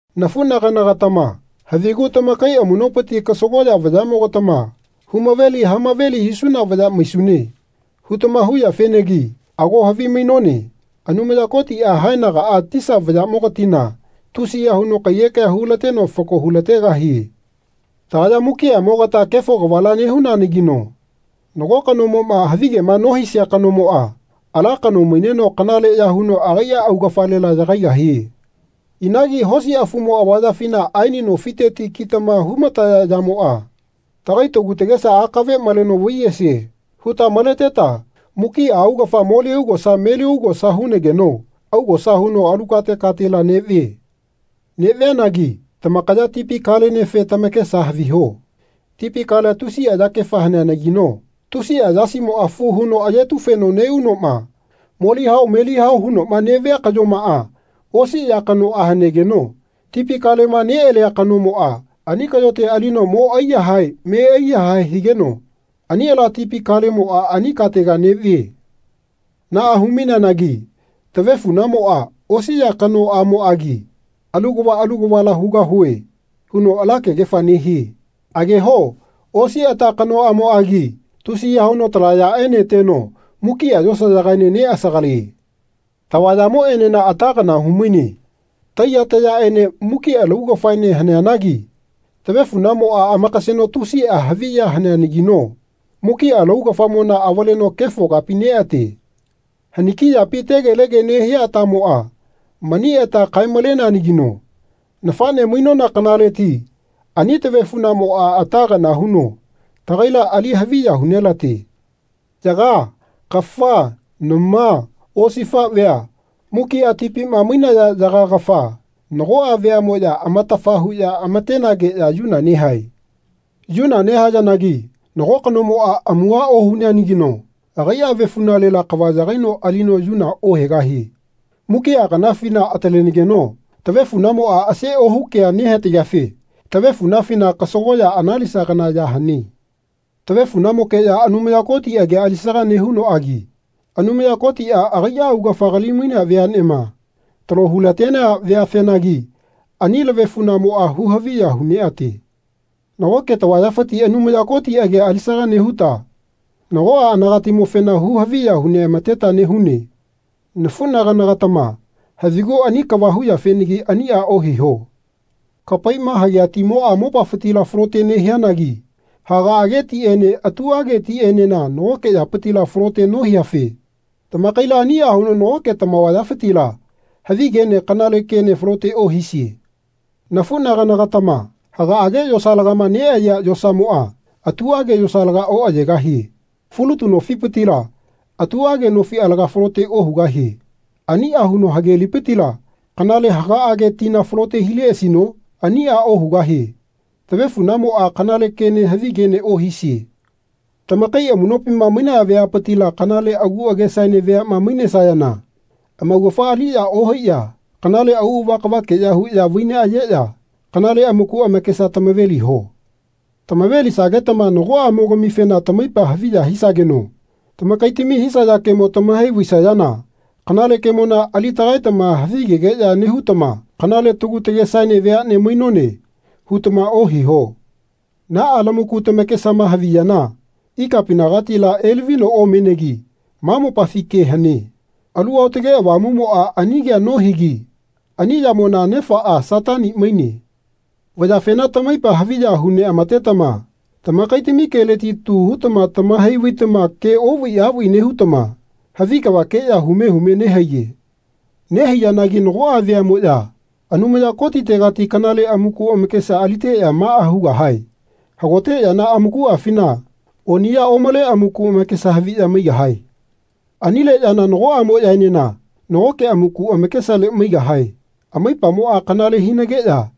Nafunagana-gatama havigu tamakai amunopiti kasagoya vayamogatama Hu-maveli ha-maveli hisuna vaya maisune. hutama huyafenagi ago havimainone Anumaya Kotia haenagaa tisa vayamogatina tusiya huno kaiyekea hulateno fako hu-lategahie. Tagaya mukiamogata kefo kavala nehunanagino nago kanomoma havigema nohisia kanomoa ala kano maineno kanaleya huno agaia augafalela yagaigahie. Inagi hosi afumo avayafina aeni nofiteti kitama hu-mataya yamoa Tagai tagu tagesa akave maleno vaiyesie. huta maleteta mukia augafa moli augosa meli augosa hunageno augosa huno alu kate katela nevie. Nevianagi tamakaya tipi kalenefe tamakesa haviho. Tipi kalea tusia yakefa haneanagino tusia yasimoa fu huno ayetu-feno neunoma moli hao meli hao hunoma nevia kayomaa osi ya kanoa hanegeno tipi kalema nealia kanomoa ani kayote alino mo aiyahae me aiyahae higeno ani ala tipi kalemoa ani katega nevie. Naa hu-maineanagi tavefunamoa osi ya kanoamoagi Alu kava alu kavala hugahue. huno ala kegefa nehie. Ageho osi ata kanoamoagi tusiya huno tala yaeneteno mukia yosayagaene neasagalie. Tavayamoenena ata kana humaine. Taiya tayaene mukia laugafaene haneanagi tavefunamoa amakaseno tusia havi ya haneanagino mukia laugafamona avaleno kefo kapi neate. Haniki yapi tegelege nehia atamoa mani ata kae-maleneanagino nafane mainona kanaleti ani tavefunamoa ata kana huno tagaila ali haviya hu nelate. Yaga, kafa, nama, osifavea, mukia tipima mainaya yaga kafa, nagoa veamoya atafa huya amatenageya yuna nehae. Yuna nehayanagi nago kanomoa amuha ohuneanagino agaia avefunalela kava yagaino alino yuna ohegahie. Mukia kanafina atalenegeno tavefunamoa ase ohu kea nehatageafe tavefunafina kasagoya analisa kana ya hane. Tavefunamokeya Anumaya Koti agia alisaga nehunoagi Anumaya Kotia agaia augafa kali-mainea veanema talo hulatenea veafenagi ani lavefunamoa hu-haviya hu neate. Nagoke tavayafiti Anumaya Koti agia alisaga nehuta nagoa anagatimofena hu-haviya hu neamateta nehune. Nafunagana-gatama havigu ani kava huyafenagi ania ohiho. Kapaima hagea timoa mopafitila falote nehianagi hagaage tiene atuage tienena nagoke yapitila falote nohiafe tamakaila ania huno nagoke tamavayafitila havi kene kanale kene falote ohisie. Nafunagana-gatama, hagaage yosalagama neayea yosamoa atuage yosalaga oayegahie. Fulutu nofipitila atuage nofi alaga falote ohugahie. Ania huno hage lipitila kanale hagaage tina falote hileasino? Ania ohugahie. Tavefunamoa kanale kene havi kene ohisie. Tamakai amunopima mainaya veapitila kanale agu agesaene veama mainesayana amaugafa aliya ohaiya kanale auava kavakeya huya vai neayeya kanale amaku amakesa tamave-liho. Tamave-lisagetama nagoamogamife tamaipa haviya hisageno tamakaitami hisaya kemo tamahai vaisayana kanale kemona ali tagaetama havigegeya nehutama Kanale tagu tagesaene veane mainone. hutama ohiho. Naa lamaku tamakesama haviyana ikapinagatila elavino omenegi ma mopafi ke hane. Alu Aotage Avamumoa ani kea nohigi ani yamona nefaa Satani maine. Vayafena tamaipa haviya hu neamatetama tamakaitami keleti tu hutama tamahai vaitama ke ovai avai nehutama havi kavakeya hume hume nehaiye. Nehaiyanagi nagoa veamoya Anumaya Kotitegati kanale amaku amakesa aliteya maa hugahae, Hagote yana amakuafina oniya omale amaku amakesa haviya maigahae. Anile yana nagoamoyaenena nagoke amaku amakesale maigahae. Amaipamoa kanale hinageya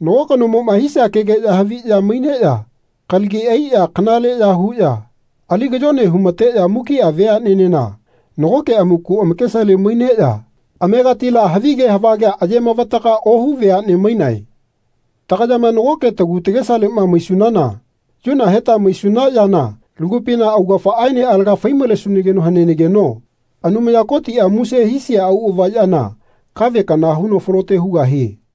nago kanomoma hisia kegeya haviya maineya kalagi aiya kanaleya huya ali kayone humateya mukia veanenena nagoke amaku amakesale maineya amegatila havige havagea aye mavataga ohu veane mainae. Tagayama nagoke tagu tagesalema maisunana yuna heta maisuna yana lagupina augafaaene alaga fai-malesunageno hanenageno Anumaya Kotia muse hisia auava yana kave kana huno falote hugahie.